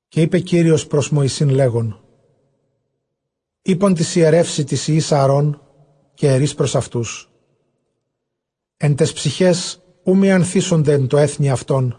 Καὶ εἶπε Κύριος πρὸς Μωυσῆν, λέγων, εἶπον τοῖς ἱερεύσι τοῖς υἱοῖς Ἀαρὼν, καὶ ἐρεῖς πρὸς αὐτούς, ἐν ταῖς ψυχαῖς οὐ μιανθήσονται ἐν τῷ ἔθνει αὐτῶν,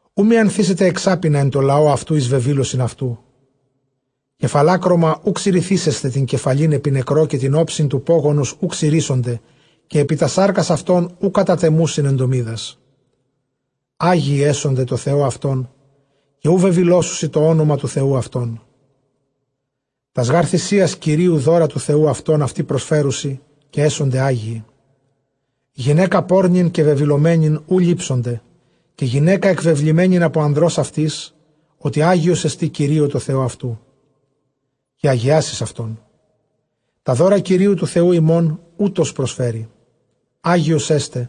Οὐ μιανθήσεται ἐξάπινα ἐν τῷ λαῷ αὐτοῦ εἰς βεβήλωσιν αὐτοῦ. Καὶ φαλάκρωμα οὐ ξυρηθήσεσθε τὴν κεφαλὴν ἐπὶ νεκρῷ· καὶ τὴν ὄψιν τοῦ πώγωνος οὐ ξυρήσονται· καὶ ἐπὶ τὰς σάρκας αὐτῶν οὐ κατατεμοῦσιν ἐντομίδας. Ἅγιοι ἔσονται τῷ Θεῷ αὐτῶν, καὶ οὐ βεβηλώσουσι τὸ ὄνομα τοῦ Θεοῦ αὐτῶν· τὰς γὰρ θυσίας Κυρίου δῶρα τοῦ Θεοῦ αὐτῶν αὐτοὶ προσφέρουσι, καὶ ἔσονται ἅγιοι. Γυναῖκα πόρνην καὶ βεβηλωμένην οὐ λήψονται, καὶ γυναῖκα ἐκβεβλημένην ἀπὸ ἀνδρὸς αὐτῆς, ὅτι ἅγιός ἐστι Κυρίῳ τῷ Θεῷ αὐτοῦ. Καὶ ἁγιάσεις αὐτόν· τὰ δῶρα Κυρίου τοῦ Θεοῦ ὑμῶν οὗτος προσφέρει, ἅγιος ἔσται·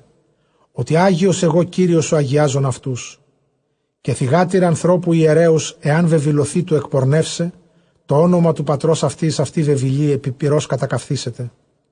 ὅτι ἅγιος ἐγὼ Κύριος ὁ ἁγιάζων αὐτούς. Καὶ θυγάτηρ ἀνθρώπου ἱερέως ἐὰν βεβηλωθῇ τοῦ ἐκπορνεύσαι, τὸ ὄνομα τοῦ πατρὸς αὐτῆς αὐτὴ βεβηλοῖ· ἐπὶ πυρὸς κατακαυθήσεται.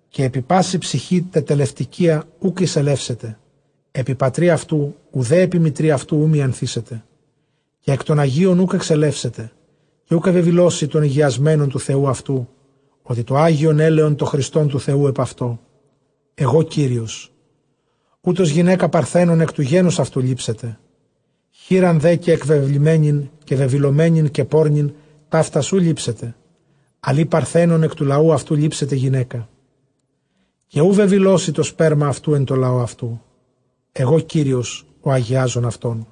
καὶ ἐπὶ πάσῃ ψυχῇ τετελευτηκυίᾳ οὐκ εἰσελεύσεται, ἐπὶ πατρὶ αὐτοῦ οὐδὲ ἐπὶ μητρὶ αὐτοῦ οὐ μιανθήσεται. Καὶ ἐκ τῶν ἁγίων οὐκ ἐξελεύσεται, καὶ οὐ βεβηλώσει τὸ ἡγιασμένον τοῦ Θεοῦ αὐτοῦ, ὅτι τὸ ἅγιον ἔλαιον τὸ χριστὸν τοῦ Θεοῦ ἐπʼ αὐτῷ· ἐγὼ Κύριος. Οὗτος γυναῖκα παρθένον ἐκ τοῦ γένους αὐτοῦ λήψεται. Χήραν δὲ καὶ ἐκβεβλημένην καὶ βεβηλωμένην καὶ πόρνην, ταύτας οὐ λήψεται, ἀλλʼ ἢ παρθένον ἐκ τοῦ λαοῦ αὐτοῦ λήψεται γυναῖκα. Καὶ οὐ βεβηλώσει τὸ σπέρμα αὐτοῦ ἐν τῷ λαῷ αὐτοῦ· ἐγὼ Κύριος ὁ ἁγιάζων αὐτόν.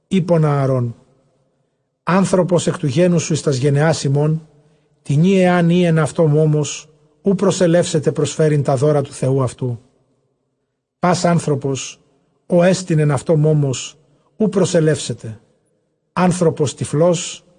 εἶπον Ἀαρὼν, ἄνθρωπος ἐκ τοῦ γένους σου εἰς τὰς γενεὰς ὑμῶν, τινὶ ἐὰν ᾖ ἐν αὐτῷ μῶμος, οὐ προσελεύσεται προσφέρειν τὰ δῶρα τοῦ Θεοῦ αὐτοῦ. πᾶς ἄνθρωπος ᾧ ἐστιν ἐν αὐτῷ μῶμος, οὐ προσελεύσεται· ἄνθρωπος τυφλὸς.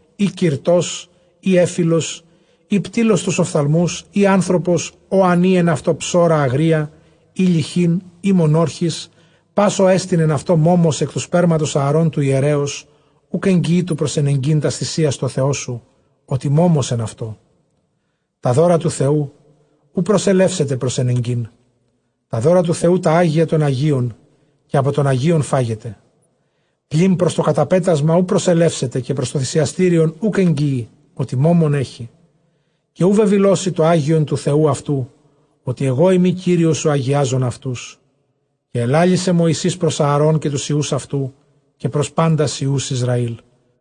ἢ κυρτὸς, ἢ ἔφηλος, ἢ πτίλλος τοὺς ὀφθαλμούς, ἢ ἄνθρωπος ᾧ ἂν ᾖ ἐν αὐτῷ ψώρα ἀγρία, ἢ λειχὴν, ἢ μονόρχις. Πᾶς ᾧ ἐστιν ἐν αὐτῷ μῶμος, ἐκ τοῦ σπέρματος Ἀαρὼν τοῦ ἱερέως, οὐκ ἐγγιεῖ τοῦ προσενεγκεῖν τὰς θυσίας τῷ Θεῷ σου, ὅτι μῶμος ἐν αὐτῷ· τὰ δῶρα τοῦ Θεοῦ οὐ προσελεύσεται προσενεγκεῖν. Τὰ δῶρα τοῦ Θεοῦ τὰ ἅγια τῶν ἁγίων, καὶ ἀπὸ τῶν ἁγίων φάγεται. Πλὴν πρὸς τὸ καταπέτασμα οὐ προσελεύσεται, καὶ πρὸς τὸ θυσιαστήριον οὐκ ἐγγιεῖ, ὅτι μῶμον ἔχει· καὶ οὐ βεβηλώσει τὸ ἅγιον τοῦ Θεοῦ αὐτοῦ, ὅτι ἐγώ εἰμι Κύριος ὁ ἁγιάζων αὐτούς. Καὶ ἐλάλησε Μωυσῆς πρὸς Ἀαρὼν καὶ τοὺς υἱοὺς αὐτοῦ, καὶ πρὸς πάντας υἱοὺς Ἱσραήλ.